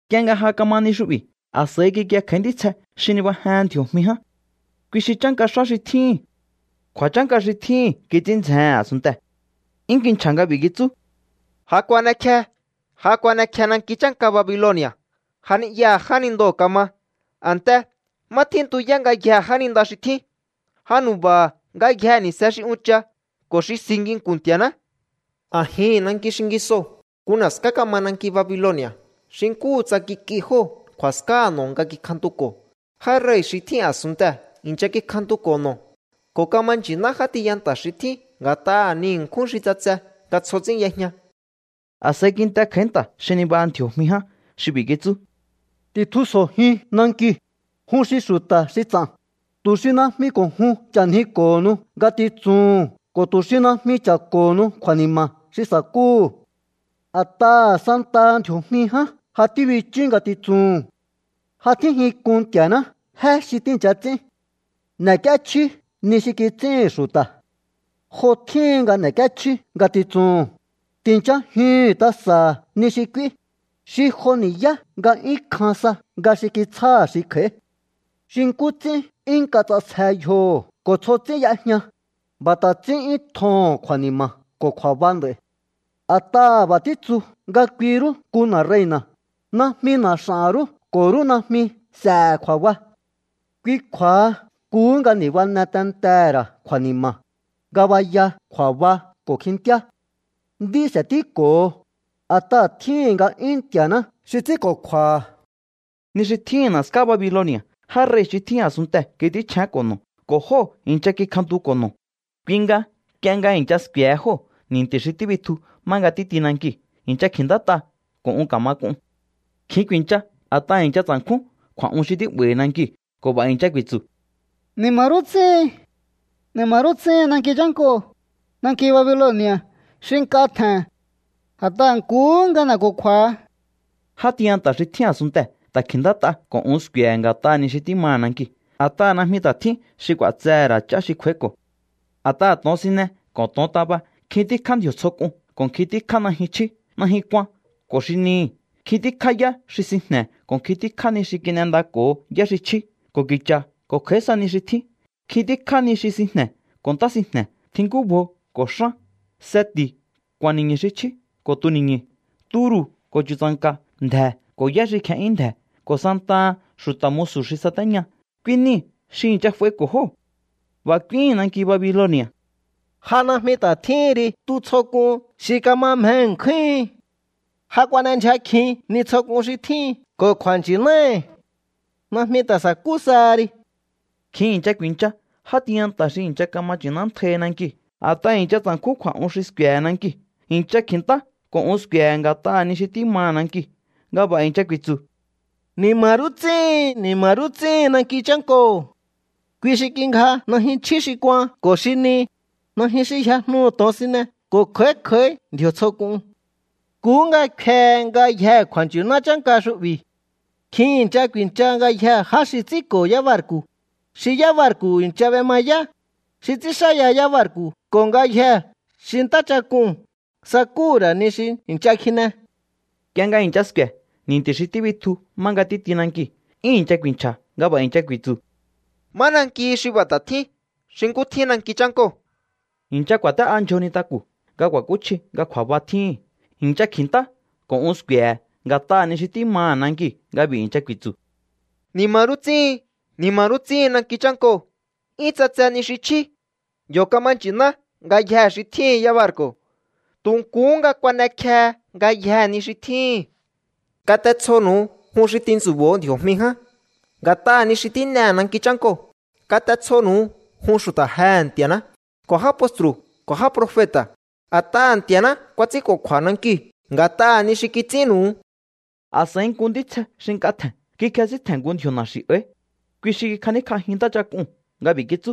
Nk'ie nga ja kama ni xu'bi̱, a̱s'a̱i kikie kj'a̱í ntítsje xi nibajehen ndji̱o̱jmi ján. Kui xi chánka xá xi tjíhi̱n. Kju̱a̱chánka xi tjíhi̱n kits'ín ndzjehe̱n a̱sunntee̱. 'Yún kinchja̱ nga b'i̱ kitsú: —Ja kuan'ekje. Ja kuan'ekje nanki chánka Babiloni̱a̱. Ja ni'yaha̱ jánindoo̱ kama, a̱nte má tjíntuyá ngayjee̱ jáninda xi tjín. Ja nu̱ba̱ha̱ ngayjee̱ ni̱se xi uncha ko̱ xi si nginku̱n Nti̱a̱ná. A̱jihi̱n nanki xingisoo̱ nku na̱ská kama nanki Babiloni̱a̱. Xi nkúhu tsa kik'i jóo̱ kju̱a̱skáha̱ no̱ nga kikjantuko̱. Já rei̱ xi tjín a̱sunntee̱ i̱ncha kikjantuko̱ no̱, ko̱ kama nchi̱ná já tiyanta̱ xi tjín nga̱t'aha̱ ni ṉkjún xi ts'atse nga tsjo ts'ín y'ejña. A̱s'a̱i kint'e kj'a̱í nta̱ xi nibaha ndji̱o̱jmi ján xi b'i̱ kitsú: —Ti̱tjusjo̱jiun nankiu̱, jun xi xu̱ta̱ xi ts'a̱n, tu̱ xi najmi ko̱ jun ch'a̱njiko̱honu ngatitsuhu̱n ko̱ tu̱ xi najmi cha̱ko̱honu kju̱a̱ni̱ma̱ xi sa̱kúhu̱. A̱t'aha̱ santaha ndji̱o̱jmi ján ja tíbichú ngatitsuhu̱n. Ja tjínjin k'un Nti̱a̱ná jé xi tíi̱ncha ts'ín. ’N'e̱k'íéchjíú ni xi kits'íhi̱n xu̱ta̱. Jo tjíhin nga n'ek'íéchjíú ngatitsuhu̱n. Ti̱nchajihu̱un tasa̱ha̱ ni xi k'úí, xi jo ni̱yá nga 'yún kjan sa nga xi kitsjáha̱ xi kj'a̱í. Xi nkú ts'ín 'yún nk'a ts'asje yjoho̱ ko̱ tsjo ts'ín y'ejña, b'a̱ ta̱ ts'ín 'yún tjoho̱n kju̱a̱ni̱ma̱ ko̱ kju̱a̱ba nd'a̱i̱. A̱t'aha̱ b'a̱ títsu nga kui rú nku na̱ rei̱na̱, najmi na̱ x'a̱n rú ko̱ rú najmi s'e̱he̱ kju̱a̱ba. Kui kju̱a̱ha nkuhú nga ni̱bane tentehe̱ ra̱ kju̱a̱ni̱ma̱, ngabaya, kju̱a̱ba ko̱ kjintíá. Nd'í s'e̱tíko̱ho, a̱t'aha̱ tjíhi̱n nga'yún Nti̱a̱ná xi ts'ínko̱kju̱a̱ha̱. Ni xi tjíhi̱n na̱ská Babiloni̱a̱ já rei̱ xi tjín a̱sunntee̱ kits'ínchjénko̱ no̱ ko̱ jóo̱ i̱ncha kikjantuko̱ no̱. Kui nga nk'ie nga i̱ncha sku̱e̱he jóo̱ ni̱nti̱ xi tíbitju má nga títi nankiu̱, i̱ncha kji̱ntát'a ko̱ un ka̱ma k'un. Kjin ku̱i̱ncha, a̱t'aha̱ i̱ncha tsa̱nkjún kju̱a̱'un xi tí'ba̱i̱hi̱ nankiu̱ ko̱ b'a̱ i̱ncha ku̱i̱tsu̱: —¡Ni̱ma̱ rú ts'íhin! ¡Ni̱ma̱ rú ts'íhin nanki chánkoo̱, nanki Babiloni̱a̱ xi nk'a tje̱n! A̱t'aha̱ nkuhú nga n'eko̱kju̱a̱ha. Játiyanta̱ xi tjín a̱sunntee̱ ta̱ kji̱ntát'a ko̱ un sku̱e̱he̱ nga̱t'aha̱ ni xi tímaha̱ nankiu̱, a̱t'aha̱ najmi ta̱ tjín xi k'u̱a̱tsehe̱ ra̱ ch'á xi kj'u̱a̱íko̱. A̱t'aha̱ to̱onsine ko̱ to̱ontaba, nkjin tíkjá ndji̱o̱ tsjo k'un ko̱ nkjin tíkjá najyun chjí, najyun kuan ko̱ xi nihi̱, nkjin tíkjá yá xi sinjne̱ ko̱ nkjin tíkjá ni xi kin'endako̱ho yá xi chjí ko̱ ki̱cha̱ ko̱ kj'a̱í sa nihi xi tjín, nkjin tíkjá ni xi sinjne̱ ko̱ ntá sinjne̱, tjink'úbjo ko̱ xán, seti̱, ku̱a̱n ni̱ñu̱ xi chjí ko̱ tuni̱ñu̱, turu̱ ko̱ chu̱tsa̱nka̱, ndje̱ ko̱ yá xi kje'yún ndje̱, ko̱ santaha xu̱ta̱ musu̱ xi satéña, kui niu̱ xi i̱ncha f'aiko̱ jóo̱. B'a̱ k'úíhi̱n nanki Babiloni̱a̱: —¡Ja najmi ta̱ tjíhin ri tu tsjo k'un xi kama mje ṉkjúhin! ¡Ja kuan'endyja kjin ni tsjo k'un xi tjíhin ko̱ kju̱a̱nchi̱náhi̱! ¡Najmi ta̱ sa̱kú saha ri! Kjin i̱ncha ku̱i̱ncha já tiyanta̱ xi i̱ncha kama nchi̱nántjaihi nankiu̱, a̱t'aha̱ i̱ncha tsa̱nkjún kju̱a̱'un xi sku̱e̱he̱ nankiu̱. I̱ncha kji̱ntá ko̱ un sku̱e̱he̱ nga̱t'aha̱ ni xi tímaha̱ nankiu̱ nga b'a̱ i̱ncha ku̱i̱tsu̱: —¡Ni̱ma̱ rú ts'íhin! ¡Ni̱ma̱ rú ts'íhin nanki chánkoo̱! Kui xi kingja najyun chjí xi kuan ko̱ xi ni, nayjun xi yjajnuhu̱ to̱onsine ko̱ kj'a̱í kj'a̱í ndji̱o̱ tsjo k'un. Nkuhú nga kfehe ngayjee̱ kju̱a̱nchi̱ná chánka xu'bi̱. Nkjin i̱ncha ku̱i̱ncha ngayjee̱ já xi ts'ínko̱ yábarku̱, xi yá barku̱ i̱ncha b'emayá, xi ts'ínxáya yábarku̱ ko̱ ngayjee̱ xi ntáchak'uu̱n sakúhu̱ra̱ ni xi i̱ncha kjine. Nk'ie nga i̱ncha sku̱e̱ ni̱nti̱ xi tíbitju má nga títi nankiu̱, 'yún i̱ncha ku̱i̱nchja̱ nga b'a̱ i̱ncha ku̱i̱tsu̱: —¿Má nankihi xi b'a̱ ta̱ tjín xi nkú tjín nanki chánkoo̱? I̱ncha ku̱a̱té'a ndyjo nintaku̱ nga ku̱a̱kúchji nga kju̱a̱ba tjíhi̱n, i̱ncha kji̱ntá ko̱ un sku̱e̱he̱ nga̱t'aha̱ ni xi tímaha̱ nankiu̱ nga b'i̱ i̱ncha ku̱i̱tsu̱: —¡Ni̱ma̱ rú ts'íhin! ¡Ni̱ma̱ rú ts'íhin nanki chánkoo̱! 'Yún ts'atse ni xi chjí. Yo̱ kama nchi̱ná ngayjee̱ xi tjíhi̱n yábarku̱. Tu̱ nkuhú nga kuan'ekjehe ngayjee̱ ni xi tjíhi̱n. Kat'etsjonu̱u, jun xi tintsu̱bo̱o ndji̱o̱jmi ján nga̱t'aha̱ ni xi tín'ehe̱ nanki chánkoo̱. Kat'etsjonu̱u, jun xu̱ta̱ jehe̱ Nti̱a̱ná ko̱ já postru̱ ko̱ já profeta̱, a̱t'aha̱ Nti̱a̱ná kuats'ínko̱kju̱a̱ nankiu̱ nga̱t'aha̱ ni xi kits'ínnu̱u. A̱s'a̱i nku ntítsje xi nk'a tje̱n kikjesíntje̱n nku ndji̱o̱ na̱xi̱ áí. Kui xi kikjaníkj'ajin ntáchak'uu̱n nga b'i̱ kitsú: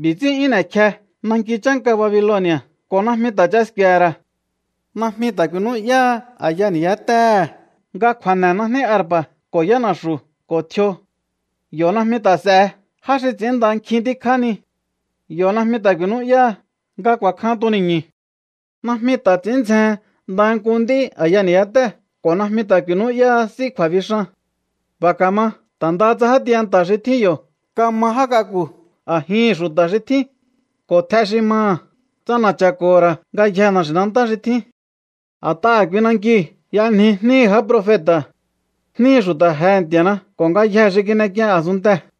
—B'i̱ ts'ín 'yún n'e̱kje nanki chánka Babiloni̱a̱ ko̱ najmi ta̱ ch'a sku̱e̱he̱ ra̱. Najmi ta̱ ku̱i̱nú'yáha a̱ya ni̱yátéhe̱ nga kju̱a̱ne̱ najní arpa̱ ko̱ yána̱xu̱ ko̱ tjio. Yo̱ najmi ta̱ s'e̱he já xi ts'ínnda nkjin tíkjá ni. Yo̱ najmi ta̱ ku̱i̱nú'yáha nga ku̱a̱kjan tuni̱ñu̱. Najmi ta̱ ts'i̱ín ndzjehen ndaha nku nd'í a̱ya ni̱yátéhe̱ ko̱ najmi ta̱ ku̱i̱nú'yáha s'í kju̱a̱bixan. B'a̱ ka̱ma ta̱ ndaha tsa já tiyanta̱ xi tjín yo̱ kama já k'aku̱ a̱jihi̱n xu̱ta̱ xi tjín ko̱ tj'e xi maha̱ ts'ana̱cha̱ko̱ho̱ ra̱ ngayjee̱ na̱xi̱nantá xi tjín. A̱t'aha̱ kui nankiu̱ y'anji jníhi̱ já profeta̱, jníhi̱ xu̱ta̱ jehe̱ Nti̱a̱ná ko̱ ngayjee̱ xi kin'ek'ien a̱sunntee̱.